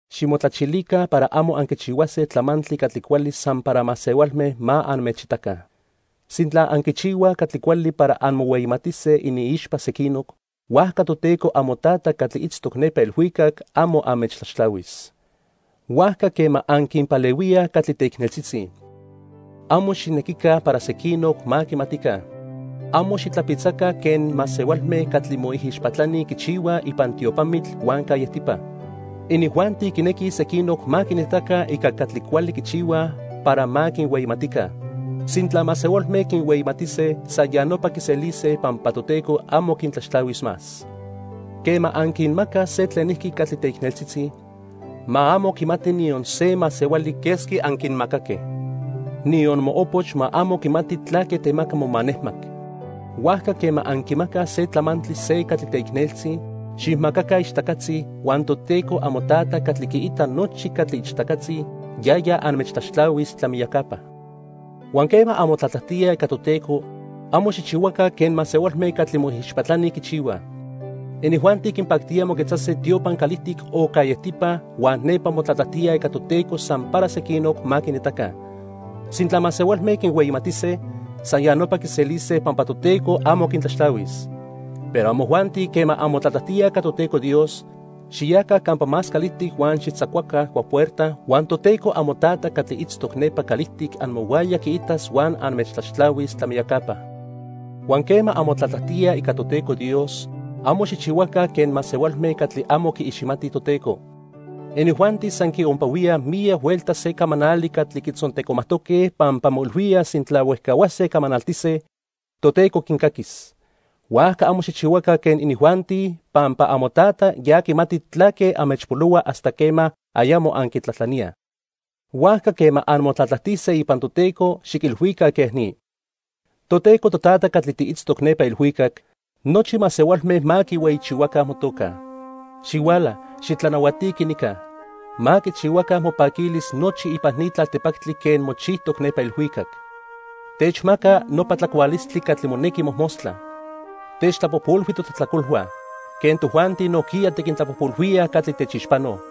"Ximotlachilica para amo anquichihuase tlamantli catli cuali san para masehualme ma anmechitaca. Sintla anquichihuaj catli cuali para anmohueyimatise iniixpa sequinoc, huajca Toteco amoTata catli itztoc nepa ilhuicac amo anmechtlaxtlahuis. Huajca quema anquinpalehuíaj catli teicneltzitzi, amo xijnequica para sequinoc ma quimatica. Amo xitlapitzaca quen masehualme catli moijixpatlani quichihuaj ipan tiopamitl huan callejtipa. Inijuanti quinequij sequinoc ma quinitaca ica catli cuali quichihuaj para ma quinhueyimatica. Sintla masehualme quinhueyimatise, san ya nopa quiselise pampa Toteco amo quintlaxtlahuis más. Quema anquinmacaj se tlenijqui catli teicneltzitzi, ma amo quimati niyon se masehuali quesqui anquinmacaque. Niyon moopoch ma amo quimati tlaque temaca momanejmac. Huajca quema anquimacaj se tlamantli se catli teicneltzi, xijmacaca ichtacatzi, huan Toteco amoTata catli quiita nochi catli ichtacatzi, yaya anmechtlaxtlahuis tlamiyacapa. "Huan quema anmotlatlajtíaj ica Toteco, amo xijchihuaca quen masehualme catli moijixpatlani quichihuaj. Inijuanti quinpactía moquetzase tiopan calijtic o callejtipa huan nepa motlatlajtíaj ica Toteco san para sequinoc ma quinitaca. Sintla masehualme quinhueyimatise, san ya nopa quiselise pampa Toteco amo quintlaxtlahuis. Pero amojuanti quema anmotlatlajtíaj ica Toteco Dios, xiyaca campa más calijtic huan xijtzacuaca cuapuerta huan Toteco amoTata catli itztoc nepa calijtic amohuaya quiitas huan anmechtlaxtlahuis tlamiyacapa. "Huan quema anmotlatlajtíaj ica Toteco Dios, amo xijchihuaca quen masehualme catli amo quiiximatij Toteco. Inijuanti san quiompahuíaj miyac huelta se camanali catli quitzontecomajtoque pampa moilhuíaj sintla huejcahuase camanaltise, Toteco quincaquis. Huajca amo xijchihuaca quen inijuanti, pampa amoTata ya quimati tlaque anmechpolohua hasta quema ayamo anquitlajtlaníaj. Huajca quema anmotlatlajtise ipan Toteco, xiquilhuica quej ni: 'Toteco Totata catli tiitztoc nepa ilhuicac. Nochi masehualme ma quihueyichihuaca motoca. Xihuala, xitlanahuatiqui nica. Ma quichihuaca mopaquilis nochi ipan ni tlaltipactli quen mochijtoc nepa ilhuicac. Techmaca nopa tlacualistli catli monequi mojmostla. Techtlapojpolhui totlajtlacolhua, quen tojuanti nojquiya tiquintlapojpolhuíaj catli techixpanoj.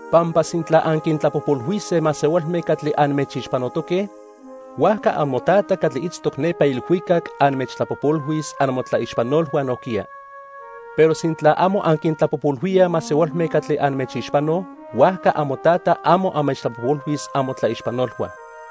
"Pampa sintla anquintlapojpolhuise masehualme catli anmechixpanotoque, huajca amoTata catli itztoc nepa ilhuicac anmechtlapojpolhuis amotlaixpanolhua nojquiya. Pero sintla amo anquintlapojpolhuíaj masehualme catli anmechixpanoj, huajca amoTata amo anmechtlapojpolhuis amotlaixpanolhua.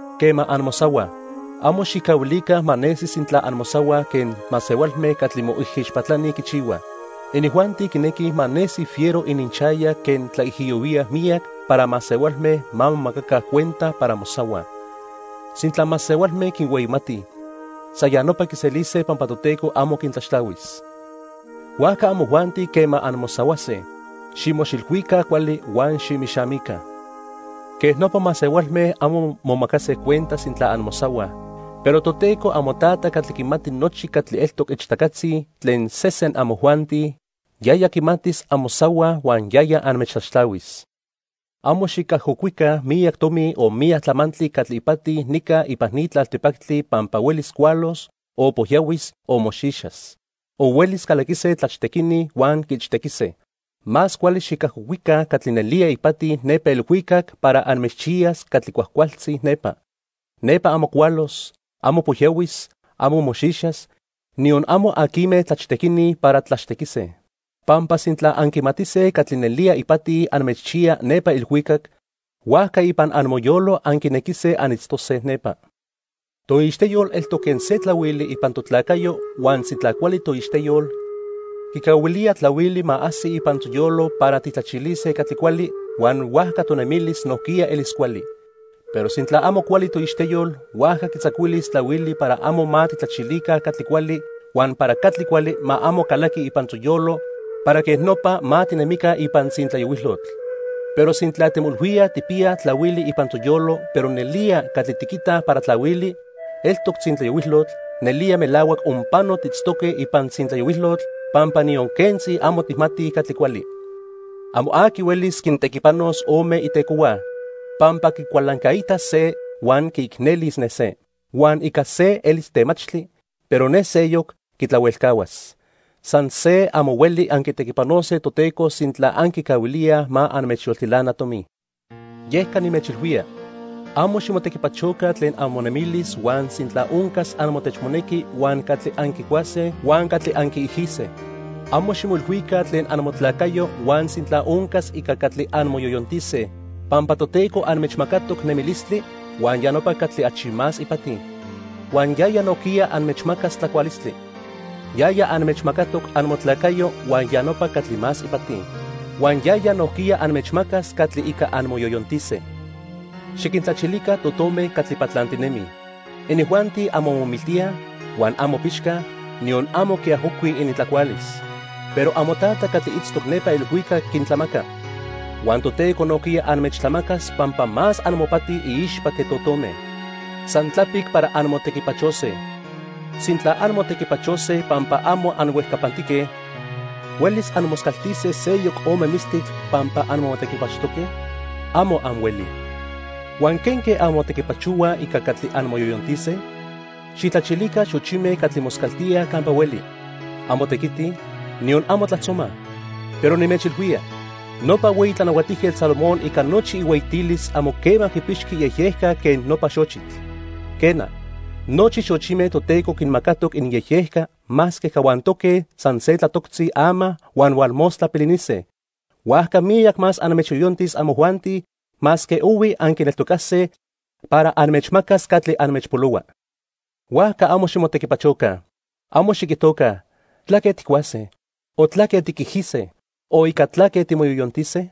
"Quema anmosahuaj, amo xijcahuilica ma nesi sintla anmosahuaj quen masehualme catli moijixpatlani quichihuaj. Inijuanti quinequij ma nesi fiero iniixayac quen tlaijiyohuíaj miyac para masehualme ma momacaca cuenta para mosahuaj. Sintla masehualme quinhueyimatij, san ya nopa quiselise pampa Toteco amo quintlaxtlahuis. Huajca amojuanti quema anmosahuase, ximoxilhuica cuali huan ximixamica. Quej nopa masehualme amo momacase cuenta sintla anmosahuaj, pero Toteco amoTata catli quimati nochi catli eltoc ichtacatzi tlen sesen amojuanti, yaya quimatis anmosahuaj huan yaya anmechtlaxtlahuis. "Amo xicajocuica miyac tomi o miyac tlamantli catli ipati nica ipan ni tlaltipactli pampa huelis cualos, o pojyahuis o moxixas. O huelis calaquise tlachtequini huan quiichtequise. Más cuali xicajocuica catli nelía ipati nepa ilhuicac para anmechchiyas catli cuajcualtzi nepa. Nepa amo cualos, amo pojyahuis, amo moxixas, niyon amo aquime tlachtequini para tlachtequise. Pampa sintla anquimatise catli nelía ipati anmechchiya nepa ilhuicac, huajca ipan amoyolo anquinequise anitztose nepa. "Toixteyol eltoc quen se tlahuili ipan totlacayo huan sintla cuali toixteyol, quicahuilía tlahuili ma ajsi ipan toyolo para tijtlachilise catli cuali, huan huajca tonemilis nojquiya elis cuali. Pero sintla amo cuali toixteyol, huajca quitzacuilis tlahuili para amo ma tijtlachilica catli cuali huan para catli cuali ma amo calaqui ipan toyolo para quej nopa ma tinemica ipan tzintlayohuilotl. Pero sintla timoilhuíaj tijpiyaj tlahuili ipan toyolo pero nelía catli tiquitaj para tlahuili, eltoc tzintlayohuilotl, nelía melahuac onpano tiitztoque ipan tzintlayohuilotl pampa niyon quentzi amo tijmatij catli cuali. "Amo aqui huelis quintequipanos ome itecohua, pampa quicualancaitas se huan quiicnelis ne se. Huan ica se elis temachtli, pero ne seyoc quitlahuelcahuas. San se, amo hueli anquitequipanose Toteco sintla anquicahuilíaj ma anmechyoltilana tomi. "Yeca nimechilhuía, amo ximotequipachoca tlen amonemilis huan sintla oncas amotechmonequi huan catli anquicuase huan catli anquiijise. Amo ximoilhuica tlen amotlacayo huan sintla oncas ica catli anmoyoyontise, pampa Toteco anmechmacatoc nemilistli, huan ya nopa catli achi más ipati; huan yaya nojquiya anmechmacas tlacualistli. Yaya anmechmacatoc amotlacayo huan ya nopa catli más ipati; huan yaya nojquiya anmechmacas catli ica anmoyoyontise. Xiquintlachilica totome catli patlantinemij. Inijuanti amo momiltíaj, huan amo pixcaj, niyon amo quiajocuij inintlacualis. Pero amoTata catli itztoc nepa ilhuicac quintlamaca. Huan Toteco nojquiya anmechtlamacas pampa más amopati iixpa que totome. San tlapic para anmotequipachose. Sintla anmotequipachose pampa amo anhuejcapantique, ¿huelis anmoscaltise seyoc ome mistitl pampa anmotequipachojtoque? Amo anhuelij. "Huan ¿quenque anmotequipachohuaj ica catli anmoyoyontise? Xijtlachilica xochime catli moscaltíaj campa hueli. Amo tequitij, niyon amo tlajtzomaj. Pero nimechilhuía, nopa hueyi Tlanahuatijquetl Salomón ica nochi ihueyitilis amo quema quipixqui iyejyejca quen nopa xochitl. Quena, nochi xochime Toteco quinmacatoc ininyejyejca masque cahuantoque san se tlatoctzi ama huan hualmostla pilinise. Huajca miyac más anmechyoyontis amojuanti, masque ohui anquineltocase para anmechmacas catli anmechpolohua. Huajca amo ximotequipachoca. Amo xiquijtoca: '¿Tlaque tijcuase? o ¿tlaque tiquijise? o ¿ica tlaque timoyoyontise?'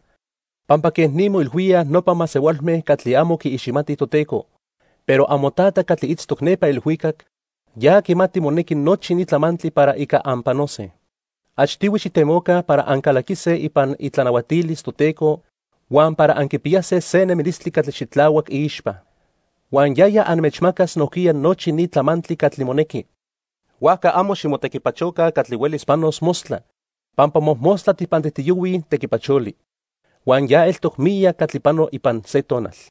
Pampa quej ni moilhuíaj nopa masehualme catli amo quiiximatij Toteco, pero amoTata catli itztoc nepa ilhuicac, ya quimati monequi nochi ni tlamantli para ica anpanose. Achtihui xijtemoca para ancalaquise ipan itlanahuatilis Toteco huan para anquipiyase se nemilistli catli xitlahuac iixpa. Huan yaya anmechmacas nojquiya nochi ni tlamantli catli monequi. Huajca amo ximotequipachoca catli huelis panos mostla. Pampa mojmostla tijpantijtiyohuij tequipacholi. Huan ya eltoc miyac catli pano ipan se tonal.